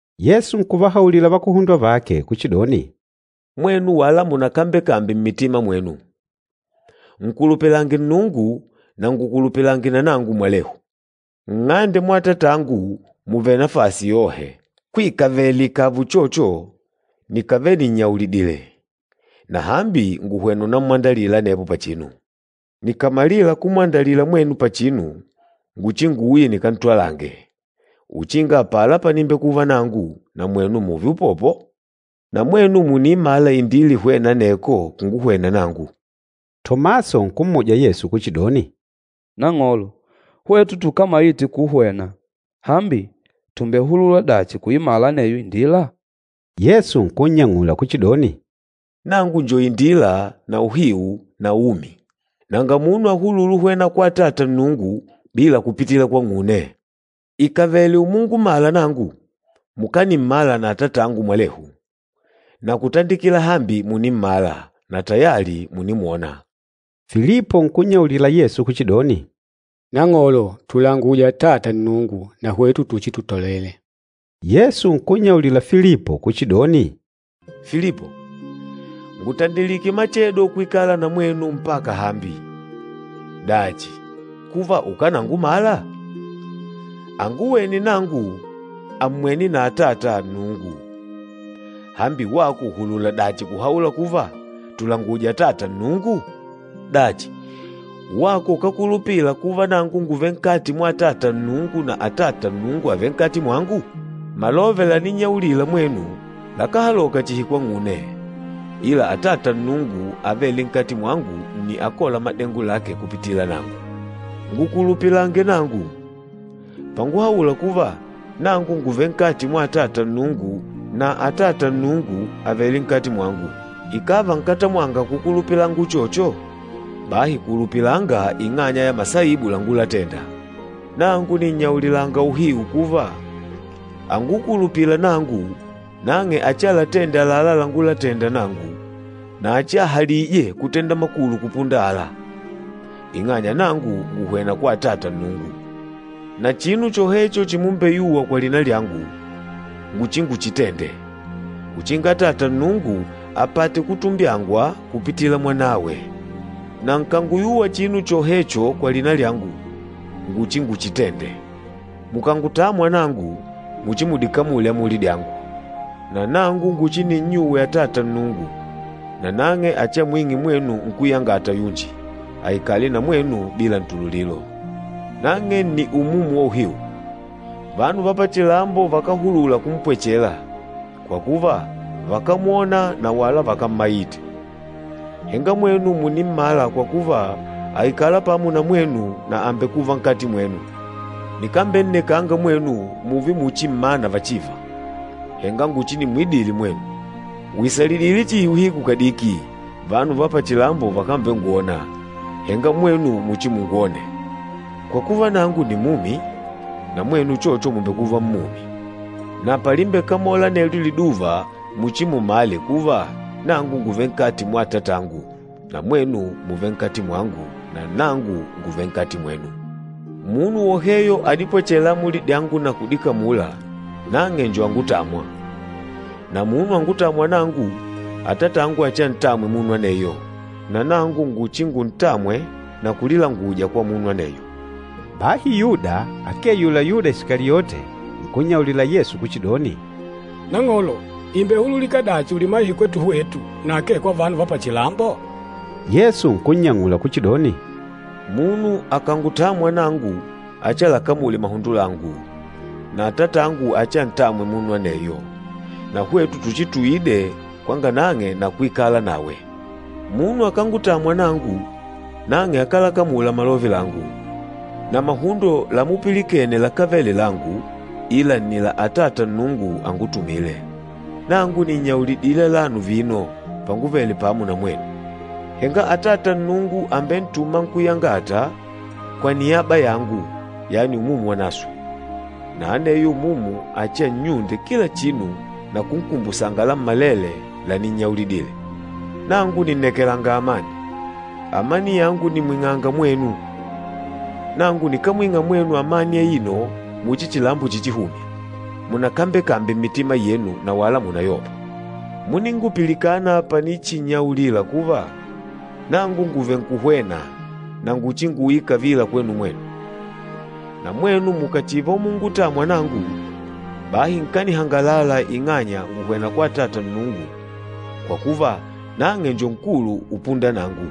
Yesu nkuvahaulila vakuhundwa vake kuchidoni, “Mwenu wala munakambekambe mmitima mwenu. Nkulupilange Nnungu, na ngukulupilange na nangu mwalehu. Nng'ande mwa Atatangu mùvele nafasi yohe, kwikavele ikàva uchocho nikàvele nìnnyaulidile. Na hambi ngùhwena unamwandalila anepo pachinu. Nikàmalila kumwandalila mwenu pachinu, nguchinguuye nikantwalange, uchinga apala panimbekuva nangu na mwenu mùùve upopo. Na mwenu mùniimala indila ìhwena aneko kunguhwena nangu.” Tomaso nkummuja Yesu kuchidoni, “Nang'olo, hwetu tukámaite kuuhwena, hambi tùmbehulula dachi kuimala aneyo indila?” Yesu nkunnyang'ula kuchidoni, “Nangu njo Indila, na Uhiu na Umi. Nanga munu ahulûla uhwena kwa Atata Nnungu bila kupitila kwang'une. Ikàvele umungumala nangu, mukanimmala na Atatangu mwalehu. Na kutandikila hambi mùnimmala, na tayali mùnimwona.” Filipo nkunnyaulila Yesu kuchidoni, “Nang'olo, tulanguje Atata Nnungu, na hwetu tuchitutolele.” Yesu nkunnyaulila Filipo nkuchidoni, “Filipo, ngùtandilike machedo kwikala na mwenu mpaka hambi, dachi kuva ukánangumala? Anguwêne nangu, àmmwene na Atata Nnungu. Hambi wako ùhulula dachi kuhaula kuva, ‘Tulanguje Atata Nnungu?’ Dachi, wako ukákulupila kuva nangu ngùvele nkati mwa Atata Nnungu na Atata Nnungu àvele nkati mwangu? Malove laninnyaulila mwenu lakáhaloka chihi kwang'une, ila Atata Nnungu àvele nkati mwangu nni akôla madengo lake kupitila nangu. Ngukulupilange nangu, panguhaula kuva, nangu ngùvele nkati mwa Atata Nnungu na Atata Nnungu àvele nkati mwangu. Ikàva nkátamwanga kukulupila uchocho, bahi kulupilanga ing'anya ya masaibu langulatenda. Nangu nìnnyaulilanga uhiu kuva, angukulupîla nangu, nang'e achialatende àlalá langulatenda nangu, na achiahalije kutenda makulu kupunda ala, ing'anya nangu ngùhwena kwa Atata Nnungu. Na chinu chohecho chimumbeyuwa kwa lina lyangu, nguchinguchitende, uchinga Atata Nnungu apate kutumbyangwa kupitila Mwanawe. Na nkànguyuwa chinu chohecho kwa lina lyangu, nguchinguchitende.” “Mukàngutamwa nangu, muchimudikamule amuli dyangu. Na nangu nguchininnyuwe Atata Nnungu, nanang'e achiamwing'e mwenu Nkúyangata yunji, aikale na mwenu bila ntululilo. Nang'e nni Umumu wa uhiu. Vanu va pachilambo vakáhulula kumpwechela, kwa kuva vakámwona na wala vakámmaite. Henga mwenu mùnimmala kwa kuva àikala pamo na mwenu na àmbekuva nkati mwenu. Nikambennekanga mwenu mùùve muchi mmana vachiva, henga nguchinimwidile mwenu. Ùisalidile chihi uhiku kadiki, vanu va pachilambo vakambengwona, henga mwenu muchimungwone. Kwa kuva nangu nimumi, na mwenu uchocho mùmbekuva mmumi. Na palimbekamola anelyo liduva muchimumale kuva nangu ngùvele nkati mwa Atatangu, na mwenu mùvele nkati mwangu na nangu ngùvele nkati mwenu. Munu woheyo adipwechêla amuli dyangu na kudikamula, nang'e nni angutâmwa. Na munu angutâmwa nangu, Atatangu achiantamwe munu aneyo, na nangu nguchinguntamwe na kulilanguja kwa munu aneyo.” Bahi Yuda, akee ayula Yuda Isikaliote, nkunnyaulila Yesu kuchidoni, “Nang'olo, ìmbehululika dachi ulimaihe kwetu hwetu na akee kwa vanu va pachilambo?” Yesu nkunnyang'ula kuchidoni, “Munu akàngutamwa nangu achialakamule mahundo langu, na Atatangu achiantamwe munu aneyo, na hwetu tuchituide kwanga nang'e na kwikala nawe. Munu akángutamwa nangu, nang'e akálakamula malove langu. Na mahundo lamupilikene lakávele langu, ila ni la Atata Nnungu angutumîle. Nangu nìnnyaulidile alano vino, panguvele pamo na mwenu. Henga Atata Nnungu àmbentuma Nkúyangata kwa niaba yangu, yani Umumu Wanaswe. Na aneyo Umumu achiannyunde kila chinu na kunkumbusanga lammalele laninnyaulidile. Nangu nìnnekela amani, amani yangu nìmwing'anga mwenu. Nangu nikámwing'a mwenu amani aino muchi chilambo chichihumya. Munakambekambe mmitima yenu na wala munayope. Múningupilikana panichinnyaulila kuva, ‘Nangu nguvenkuhwena, na nguchinguuye kavila kwenu mwenu.’ Na mwenu mukàchiva umungutamwa nangu, bahi nkanihangalala ing'anya ngùhwena kwa Atata Nnungu, kwa kuva, nang'e njo nkulu upunda nangu.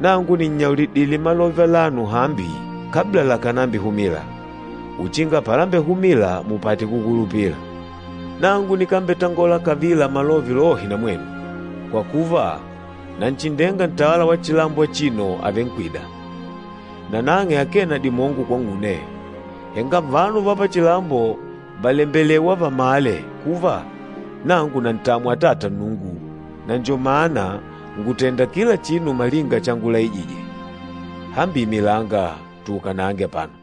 Nangu nìnnyaulidile malove alano hambi kabla lakànambihumila, uchinga palambehumila mupate kukulupila. Nangu nikambetangola kavila malove lohe na mwenu, kwa kuva, Nanchindenga ntawala wa chilambo achino àvenkwida. Na nang'e akee na dimongo kwang'une, henga vanu va pachilambo vàlembelewa vamale kuva nangu nàntamwa Atata Nnungu, na njo mana ngùtenda kila chinu malinga changulaijije. Hambi imilanga, tuukanange apano!”